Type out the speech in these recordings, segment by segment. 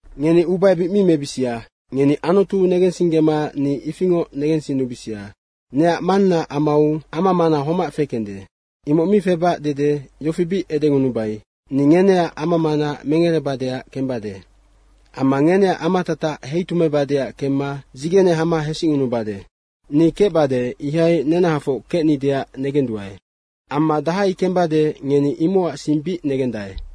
Ngeni ubaebic mi mebisia. Ngeni Anutu negensinggema ni ifingoc negensinnubisia. Neac Mannaac amau amamana homac fekende. Imoc mi febac dede yofi bic edengunubai, “Ni ngeneac ama mana mengerebadeac kembade. Amma ngeneac amatatac heitumeibadeac kemma dzigene hama hesicngunubade. Ni kecbade, ihai nenahafoc kecnideac negenduae. Amma dahai kembade, ngeni imocac sing bic negendae.”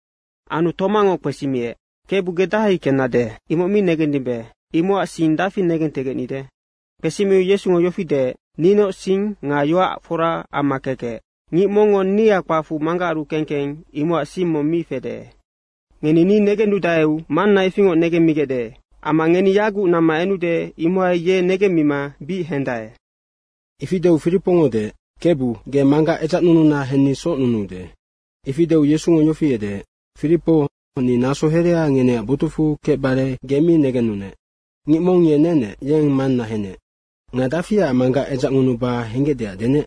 Anu Tomango kpesimiec, “Kebu, ge dahai kennade, imoc mi negendimbe. Imocac sing dafi negentegecnide?” Kpesimiu Yesungo yofi deec, “Ninoc sing nga yoac fora amma kekec. Ngic mongngo nia kpacfu Manggacaru keng keng imocac sing mong mi fede. Ngeni ni negennudaeu Manna ifingoc negemmigecde. Amma ngeni yaguc namma enude imohai ye negemmima bic hendae.” Ifi deu Firipongo deec, “Kebu, ge Manggac edzacnununa henni socnunuude.” Ifi deu Yesungo yofi edeec, “Firipo, ni naso herea ngeneac botucfu kecbare ge mi negennunec. Ngic mong ye nenec, yeng Manna henec. Nga dafiac Manggac edzacngunuba henggecdeac denec?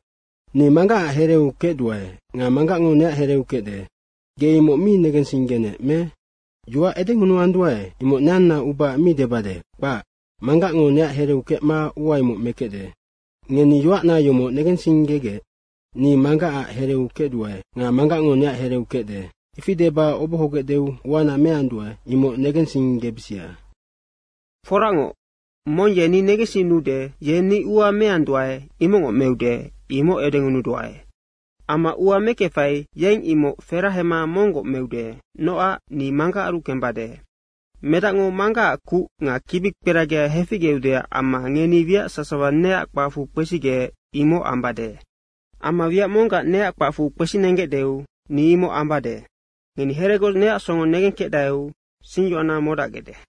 Ni Manggacac hereu kecduae nga Manggacngo neac hereu kecde. Ge imoc mi negensinggenec me? Yoac edengunuanduae, imoc neanna ubaac mi debade, kpac. Manggacngo neac hereu kecma ua imoc mekecde. Ngeni yoacna yomoc negensinggegec, ni Manggacac hereu kecduae nga Manggacngo neac hereu kecde. Ifi deba obohogecdeu uana meanduae, imoc negensinggebisia. Foracngoc, mong ye ni negensinnude, ye ni ua meanduae, imocngoc meude, imoc edengunuduae. Amma ua mekefai, yeng imoc ferahema monggoc meude, nocac ni Manggacaru kembade. Medacngo Manggacac kuc nga kibikperagi heficgeudeac amma ngeni wiac sasawa neac kpacfu kpesigec, imoc ambade. Amma wiac monggac neac kpacfu kpesinenggecdeu ni imoc ambade. Ngeni heregoc neac songo negenkecdaeu singyoacna modacgecde.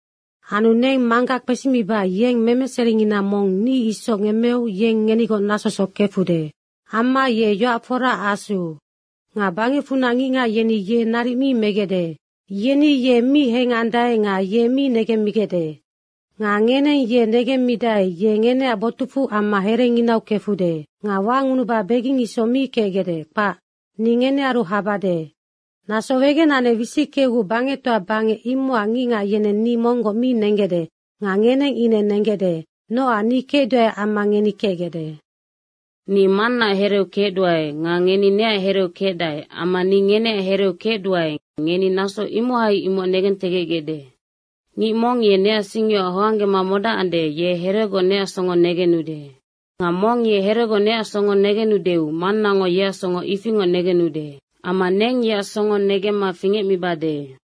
Anu neng Manggac kpesimiba yeng memeseringina mong ni isoc ngemmeu yeng ngenigoc nasosoc kefude. Amma ye yoac foraac Asu. Nga bangecfunac ngicngac yeni ye naric mi megecde. Yeni ye mi hengandae nga ye mi negemmigecde. Nga ngeneng ye negemmidae, ye ngeneac botucfu amma herenginaunoc kefude. Nga wangunuba beging isoc mi kecgecde, kpac. Ni ngenearu habade. Naso wegenanec wisickeuguc bangectoa bangec imocac ngicngac yeneng ni monggoc mi nenggecde nga ngeneng ine nenggecde, nocac ni kecduaeac amma ngeni kecgecde. Ni Mannaac hereu kecduae nga ngeni neac hereu kecdae amma ni ngeneac hereu kecduae, ngeni naso imohai imoc negentegecgecde. Ngic mong ye neac singyoac hoanggema modacande, ye heregoc neac songo negenude. Nga mong ye heregoc neac songo negenudeu Mannango yeac songo ifingoc negenude. Amma neng yeac songo negemma fingecmibade.”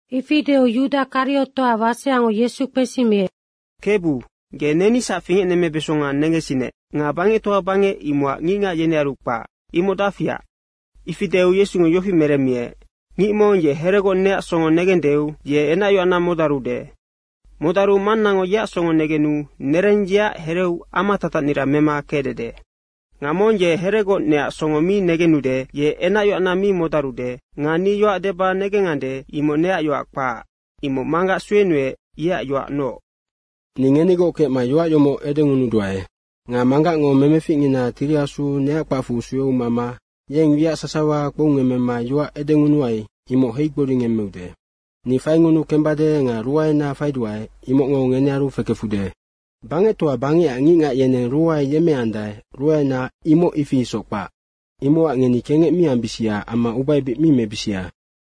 Ifi deu Yuda Kariotoac waseango Yesu kpesimiec, “Kebu, ge nenisac fingecnemmebesonga negensinec nga bangectoa bangec, imocac ngicngac yenearu kpac, imoc dafiac?” Ifi deu Yesungo yofi meremmiec, “Ngic mong ye heregoc neac songo negendeu ye enacyoacna modarude. Modaru Mannango yeac songo negenu nereng yeac hereu amatatacnira mema kecdede. Nga mong ye heregoc neac songo mi negenude, ye enacyoacna mi modarude. Nga ni yoac deba negengandae, imoc neac yoac kpac, imoc Manggac suenuec yeac yoacnoc. Ni ngenigoc kecma yoac yomoc edengunuduae. Nga Manggacngo memeficngina Tiri Asu neac kpacfu sueu mama yeng wiac sasawa kpoungemmema yoac edengunuai, imoc heigboringemmeude. Ni faingunu kembade nga ruaena faiduae, imocngo ngenearu fekefude. Bangectoa bangecac ngicngac yeneng ruae yemmeandae, ruaena imoc ifi isoc kpac. Imocac ngeni kengec mi ambisia amma ubaebic mi mebisia.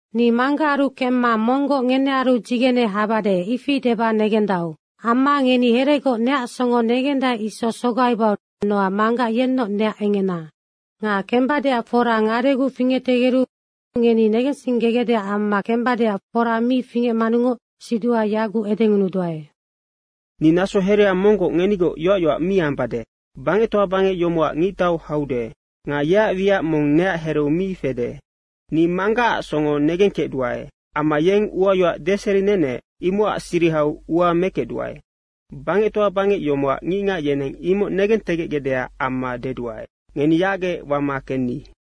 Ni Manggacaru kemma monggoc ngenearu dzigene habade, ifi deba negendau. Amma ngeni heregoc neac songo negendae isoc sogaibau nocac Manggac yennoc neac engena. Nga kembadeac fora ngadeguc fingectegeru ngeni negensinggegecdeac amma kembadeac fora mi fingecmanungoc siduha yaguc edengunuduae. Ni naso herea monggoc ngenigoc yoac yoac mi ambade. Bangectoa bangec yomocac ngictau haude. Nga yeac wiac mong neac hereu mi fede. Ni Manggacac songo negengkecduae. Amma yeng uayoac deserinenec, imocac sirihau ua mekecduae, bangectoa bangec yomocac ngicngac yeneng imoc negentegecgecdeac amma deduae, ngeni yacgec wama kenni.”